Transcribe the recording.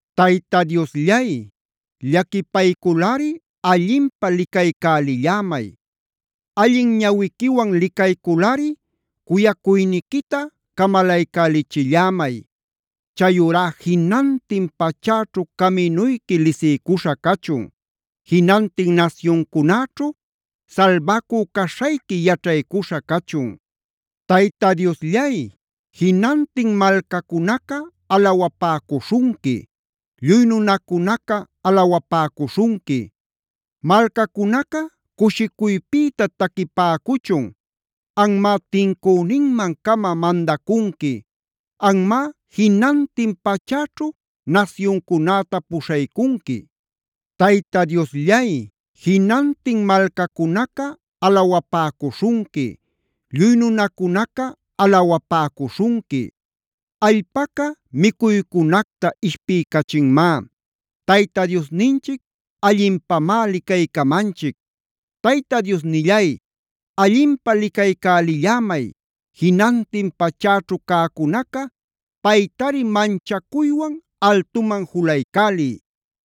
Tayta Diosllay, llaquipayculꞌari allinpä licaycälillämay. Allin ñawiquiwan licayculꞌari cuyacuyniquita camalaycälichillämay. Chayurá jinantin pachäćhu caminuyqui lisiycuśha cachun. Jinantin nasyuncunäćhu salbacü caśhayqui yaćhaycuśha cachun. Tayta Diosllay, ¡jinantin malcacunaca alawapäcuśhunqui! ¡Lluy nunacunaca alawapäcuśhunqui! Malcacunaca cushicuypïta taquipäcuchun. Anmá tincüninman-cama mandacunqui. Anmá jinantin pachäćhu nasyuncunäta puśhaycunqui. Tayta Diosllay, ¡jinantin malcacunaca alawapäcuśhunqui! ¡Lluy nunacunaca alawapäcuśhunqui! Allpaca micuycunacta ishpiycachinmá. Tayta Diosninchic allinpamá licaycamanchic. Tayta Diosnillay, allinpä licaycälillämay. Jinantin pachäćhu cäcunaca paytari manchacuywan altuman juluycäliy.